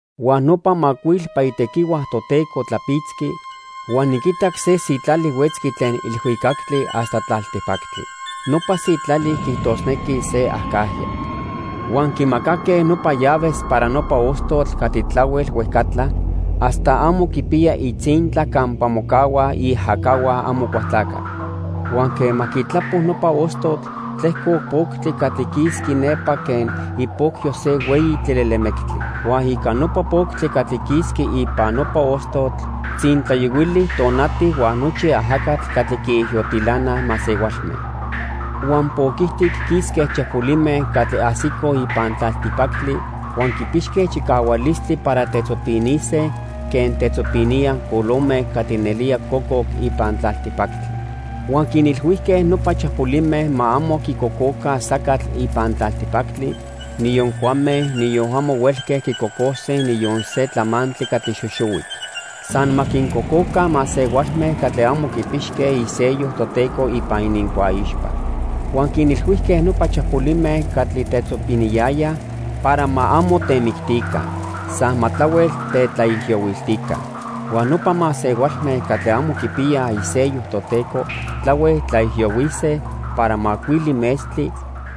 Huan nopa macuilpa itequihua Toteco tlapitzqui huan niquitac se sitlali huetzqui tlen ilhuicactli hasta tlaltipactli. Nopa sitlali quiijtosnequi se acajya. Huan quimacaque nopa llaves para nopa ostotl catli tlahuel huejcatla hasta amo quipiya itzintla campa mocahuaj iajacahua Amocualtlacatl. Huan quema quitlapo nopa ostotl, tlejcoc poctli catli quisqui nepa quen ipocyo se hueyi tlilelemectli. Huan ica nopa poctli catli quisqui ipan nopa ostotl tzintlayohuili tonati huan nochi ajacatl catli quiijiyotilanaj masehualme. Huan poc ijtic quisque chapolime catli ajsicoj ipan tlaltipactli huan quipixque chicahualistli para tetzopinise quen tetzopiníaj colome catli nelía cococ ipan tlaltipactli. Huan quinilhuijque nopa chapolime ma amo quicococa sacatl ipan tlaltipactli, niyon cuame, niyon amo huelque quicocose niyon se tlamantli catli xoxohuic. San ma quincococa masehualme catli amo quipixque isello Toteco ipan inincuaixpa. Huan quinilhuijque nopa chapolime catli tetzopiniyayaj para ma amo temictica. San ma tlahuel tetlaijiyohuiltica. Huan nopa masehualme catli amo quipiyaj isello Toteco tlahuel tlaijiyohuise para macuili metztli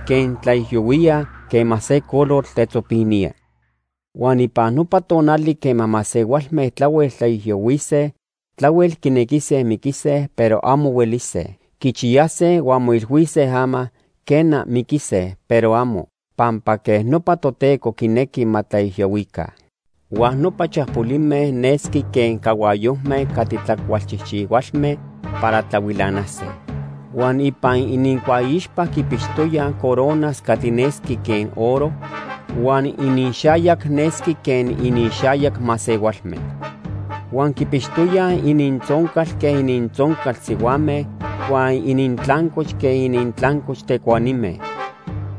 quen tlaijiyohuíaj quema se colotl tetzopinía. Huan ipan nopa tonali quema masehualme tlahuel tlaijiyohuise, tlahuel quinequise miquise, pero amo huelise. Quichiyase huan moilhuise ama, quena, miquise, pero amo, pampa quej nopa Toteco quinequi ma tlaijiyohuica. Huan nopa chapolime nesqui quen cahuayojme catli tlacualchijchihualme para tlahuilanase. Huan ipan inincuaixpa quipixtoyaj coronas catli nesqui quen oro huan iniixayac nesqui quen iniixayac masehualme. Huan quipixtoyaj inintzoncal quen inintzoncal sihuame, huan inintlancoch quen inintlancoch tecuanime.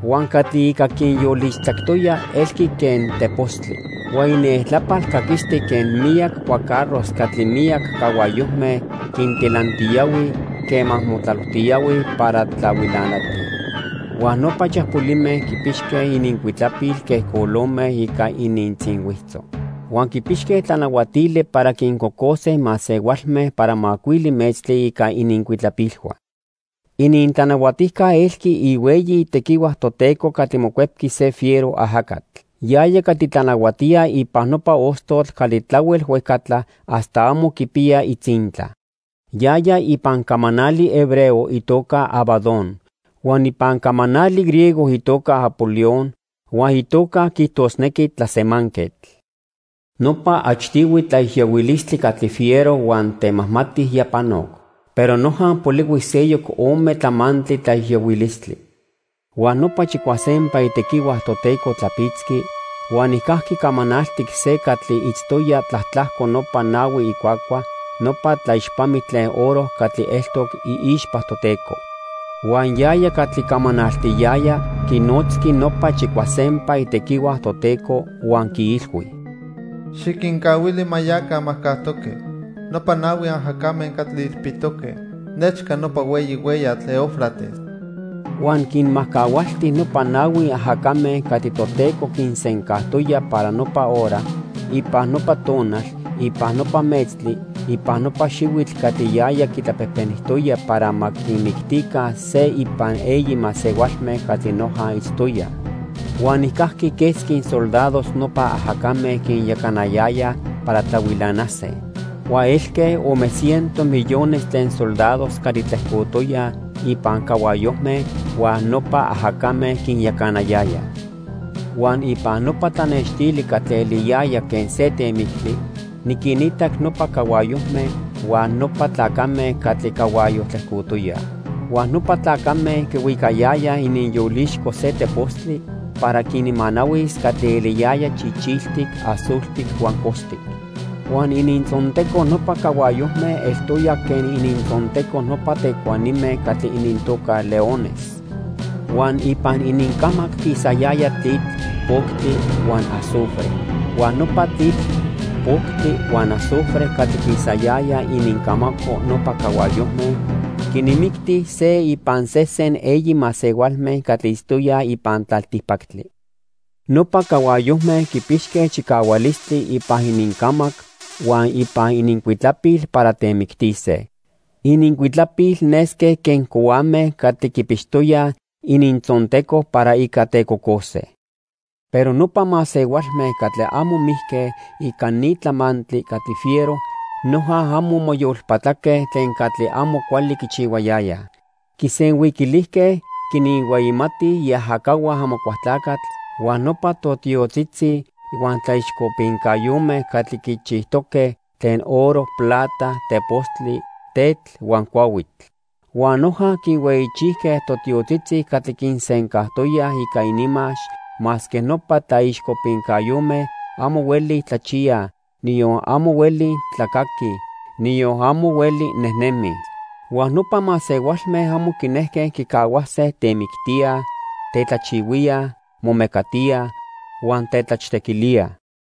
Huan catli ica quinyolixtzactoya elqui quen tepostli. Huan inieltlapal caquisti quen miyac cuacarros catli miyac cahuayojme quintilantiyohuij quema motlalojtiyohuij para tlahuilanatij. Huan nopa chapolime quipixque inincuitlapil quen colome ica inintzinhuitzo. Huan quipixque tlanahuatili para quincocose masehualme para macuili metztli ica inincuitlapilhua. Inintlanahuatijca elqui ihueyi tequihua Toteco catli mocuepqui se fiero ajacatl. Yaya catli tlanahuatía ipan nopa ostotl catli tlahuel huejcatla hasta amo quipiya itzintla. Yaya ipan camanali hebreo itoca Abadón. Huan ipan camanali griego itoca Apolión, huan itoca quiijtosnequi Tlasemanquetl. Nopa achtihui tlaijiyohuilistli catli fiero huan temajmati ya panoc, pero noja polihui seyoc ome tlamantli tlaijiyohuilistli. Huan nopa chicuasempa itequihua Toteco tlapitzqui huan nijcajqui camanaltic se catli itztoya tlatlajco nopa nahui icuacua nopa tlaixpamitl tlen oro catli eltoc iixpa Toteco. Huan yaya catli camanaltiyaya quinotzqui nopa chicuasempa itequihua Toteco huan quiilhui: "Xiquincahuili ma yaca majcajtoque nopa nahui ajacame catli ilpitoque nechca nopa hueyi hueyatl Eufrates." Huan quinmajcahualti nopa nahui ajacame catli Toteco quinsencajtoya para nopa hora, ipan nopa tonal, ipan nopa metztli, ipan nopa xihuitl catli yaya quitlapejpenijtoya para ma quinmictica se ipan eyi masehualme catli noja itztoyaj. Huan nijcajqui quesqui soldados nopa ajacame quinyacanayayaj para tlahuilanase. Huan elque ome ciento millones tlen soldados catli tlejcotoyaj ipan cahuayojme huan nopa ajacame quinyacanayayaj. Huan ipan nopa tlanextili catli eliyaya quen se temictli niquinitac nopa cahuayojme huan nopa tlacame catli cahuayo tlejcotoyaj. Huan nopa tlacame quihuicayayaj ininyolixco se tepostli para quinmanahuis catli eliyaya chichiltic, azultic huan costic. Huan inintzonteco nopa cahuayojme eltoya quen inintzonteco nopa tecuanime catli inintoca leones. Huan ipan inincamac quisayaya tlitl, poctli huan azufre. Huan nopa tlitl, poctli huan azufre catli quisayaya inincamaco nopa cahuayojme quinmicti se ipan sesen eyi masehualme catli itztoyaj ipan tlaltipactli. Nopa cahuayojme quipixque chicahualistli ipan inincamac huan ipan inincuitlapil para temictise. Inincuitlapil nesque quen cohuame catli quipixtoyaj inintzonteco para ica tecocose. Pero nopa masehualme catli amo mijque ica ni tlamantli catli fiero noja amo moyolpatlaque tlen catli amo cuali quichihuayayaj. Quisenhuiquilijque quinhueyimatij iajacahua Amocualtlacatl huan nopa totiotzitzi huan tlaixcopincayome catli quichijtoque tlen oro, plata, tepostli, tetl huan cuahuitl. Huan noja quinhueyichijque totiotzitzi catli quinsencantoyaj ica ininmax masque nopa tlaixcopincayome amo hueli tlachiyaj, niyon amo hueli tlacaquij, niyon amo hueli nejnemij. Huan nopa masehualme amo quinejque quicahuase temictíaj, tetlajchihuíaj, momecatíaj huan tetlachtequilíaj.